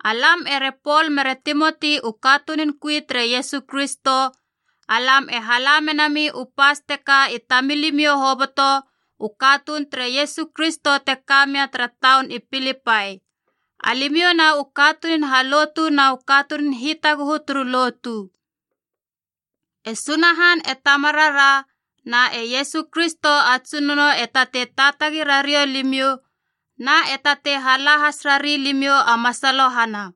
Alam ere Pol mere Timoti u katunun kui tere Iesu Kristo, alam e hala menami u pas teka i tamilimiou hoboto u katuun tere Iesu Kristo te ka mia tara taun i Pilipai, alimiou na u katunun halotu na u katunun hitaguhu turu lotu. E Sunahan e Tamarara na e Iesu Kristo a Tsunono e tatei taatagi rariou limiou na e tatei hala has rari limiou a masalohana.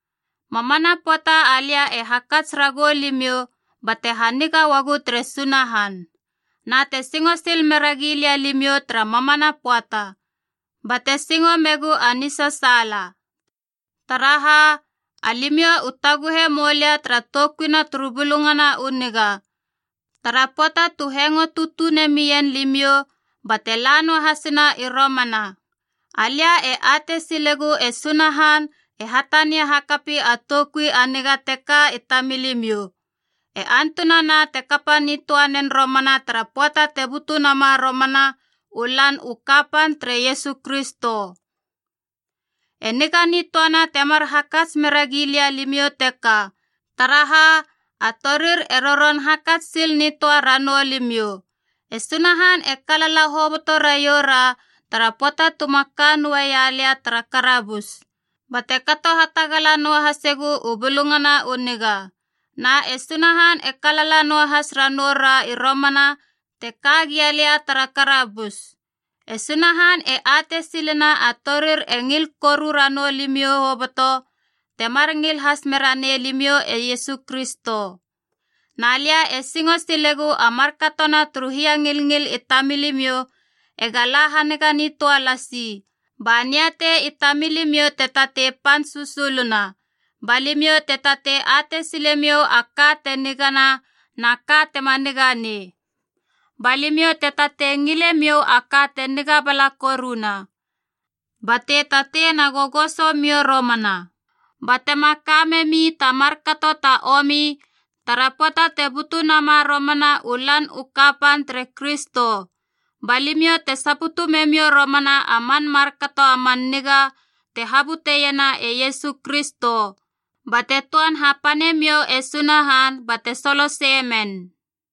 Mamana pöata alia e hakats ragou limiou bate haniga uagu tere Sunahan. Na te singo sil meragi lia limiou tara mamana pöata, bate singo megu a nisasaala. Taraha, alimiou u taguhe moulia tara toukuina turu Bulungana u Niga, tara pöata tu hengo tutune mien limiou bate la noahasina i romana. Alia e atei silegu e Sunahan e hatania hakapi a toukui a niga teka i tamilimiou, e antunana te kapa nitöa nen romana tara pöata te butu nama romana u Lan u Kapan tere Iesu Kristo. E niga nitöana temar hakats mera gilia limiou teka, taraha a torir e roron hakats sil nitöa ranoulimiou. E Sunahan e kalala hoboto raioura tara pöata tuma ka noaia lia tara karabus, bate kato hatagala noahasegu u Bulungana u Niga. Na e Sunahan e kalala noahas ranou ra i romana te ka gia lia tara karabus. E Sunahan e atei silena a torir e ngil koru ranou limiou hoboto temar ngil has mera nei limiou e Iesu Kristo. Na lia e singo silegu a markatona turu hiangilngil i tamilimiou ega la haniga nitöa lasi, ba niatei i tamilimiou te tatei pan susuluna, ba limiou te tatei atei silemiou a ka te nigana na a ka tema niga nei. Ba limiou te tatei ngile miou a ka te niga bala koruna. Bate tatei na gogosomiou romana batema ka memi ta markato ta omi tara pöata te butu nama romana u Lan u Kapan tere Kristo. Ba limiou te saputu memiou romana a man markato a man niga te habuteiena e Iesu Kristo, bate töan hapanemiou e Sunahan bate soloseie men.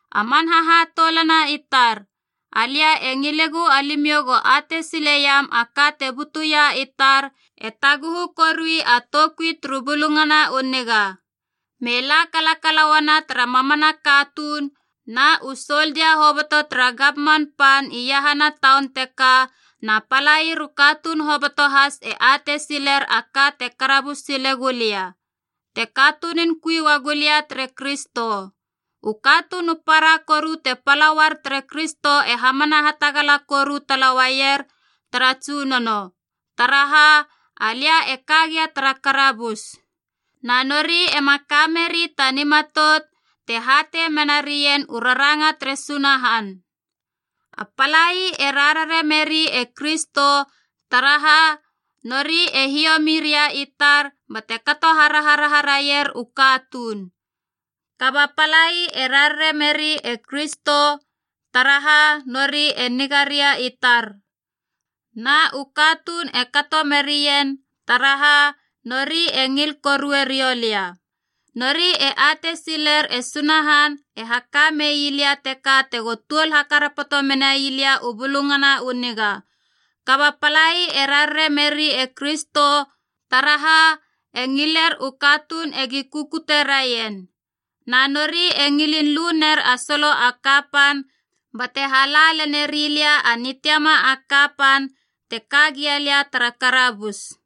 A man hahatoulana i tar, alia e ngilegu alimiou go atei sileiam a ka te butuia i tar e taguhu korui a toukui turu Bulungana u Niga. Me la kalakala uana tara mamana katuun, na u soldia hoboto tara gamman pan iahana taun teka na palair u katuun hoboto has e atei siler a ka te karabus silegu lia, te katunun kui uagu lia tere Kristo. U katuun u para koru te pala uar tere Kristo e hamana hatagala koru tala uaier tara Tsunono, taraha alia e ka gia tara karabus. Na nori ema ka meri ta nimatout te hatei menarien u raranga tere Sunahan. A palai e rarare meri e Kristo taraha nori e hiomi ria i tar bate kato haraharaha raier u katuun. Kaba palai e rarare meri e Kristo taraha nori e niga ria i tar. Na u katuun e kato merien taraha nori e ngil korue riou lia. Nori e atei siler e Sunahan e haka mei lia teka tego tuol hakarapoto menai lia u Bulungana u Niga. Kaba palai e rarare meri e Kristo, taraha e ngiler u katuun egi kukute raien. Na nori e ngilin lu ner a solo a kapan bate hala leneri lia a nitiama a kapan te kagia lia tara karabus.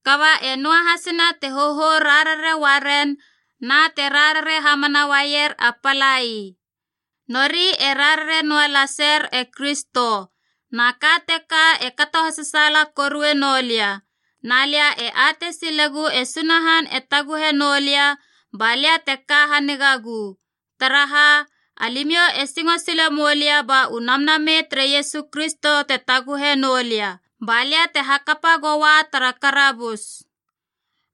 Kaba e noahasina te hohou rarare uaren na te rarare hamana uaier a palai. Nori e rarare noa laser e Kristo, na ka teka e kato hasasaala korue noulia. Na lia e atei silegu e Sunahan e taguhe noulia ba lia te ka hanigagu, taraha alimiou e singo sile moulia ba u Namnamei tere Iesu Kristo te taguhe noulia, ba lia te hakapa goua tara karabus.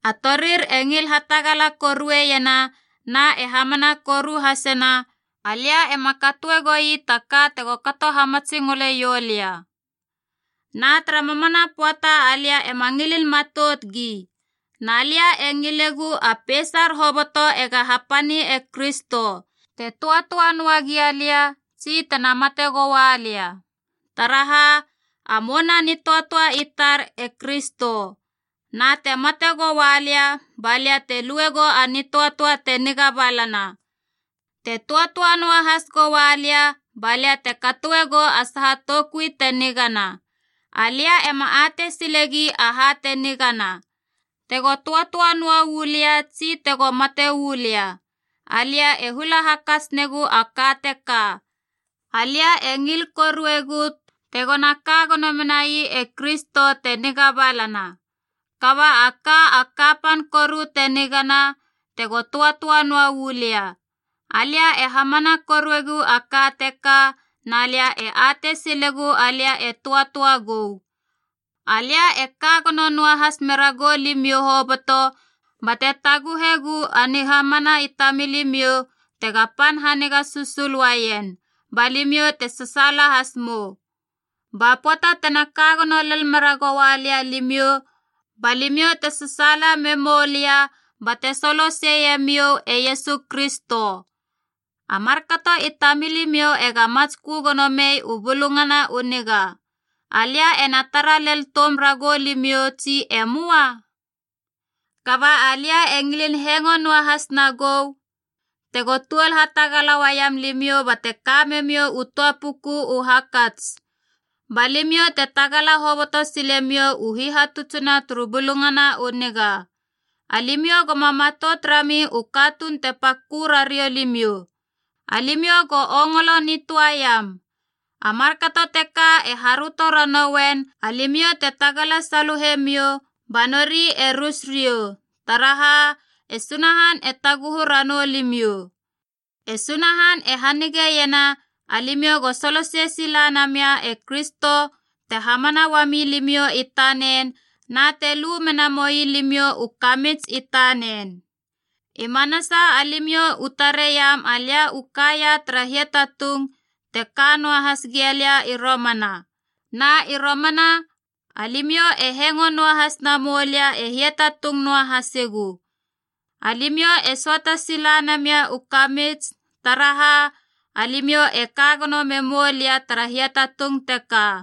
A torir e ngil hatagala koruena na e hamana koru hasena alia ema katoe goi ta ka tego kato hamatsingole ioulia. Na tara mamana pöata alia ema ngilin matout gi. Na lia e ngilegu a peisar hoboto ega hapani e Kristo, te töatöa noa gialia tsi tena mate goalia. Taraha, a mouna a nitöatöa i tar e Kristo. Na te mate goua lia, ba lia te lue gou a nitöatöa te niga balana. Te töatöa noahas goua lia, ba lia te katoe gou a saha toukui te nigana. Alia ema atei silegi aha te nigana: tego töatöa noa uu lia tsi tego mate uu lia. Alia e hula hakats negu a ka teka. Alia e ngil koruegu tegona ka gono menai e Kristo, te niga balana. Kaba a ka a kapan koru te nigana, tego töatöa noa uu lia. Alia e hamana koruegu a ka teka, na lia e atei silegu alia e töatöa gou. Alia e ka gono noahas meragou limiou hoboto bate taguhegu a nihamana i tamilimiou tega pan haniga susul uaien, ba limiou te sasaala has mou. Ba pöata tena ka gono lel mera goua lia alimiou, ba limiou te sasaala memou lia bate soloseie miou e Iesu Kristo. A markato i tamilimiou ega matskö gono mei u Bulungana u Niga. Alia ena tara lel toum ragou limiou tsi e möa? Kaba alia e ngilin hengo noahas nagou tego tuol hatagala uaiam limiou bate ka memiou u töa puku u hakats, ba limiou te tagala hoboto silemiou u hihatutsina turu Bulungana u Niga. Alimiou goma matout rami u katuun te pakö rariou limiou. Alimiou go ongolo nitöaiam. A markato teka e haröto ranouien alimiou te tagala saluhe miou ba nori e rus riou, taraha e Sunahan e taguhu ranou limiou. E Sunahan e hanigeiena, alimiou go solosei sila namia e Kristo te hamana uami limiou i tanen na te lu mena moi limiou u kamits i tanen. I manasa alimiou u tareiam alia u kaia tara hiatatung te ka noahas gia lia i romana, na i romana alimiou e hengo noahas namou lia e hiatatung noa hasigu. Alimiou e söata sila namia u kamits taraha, alimiou e ka gono me moulia tara hiatatung teka.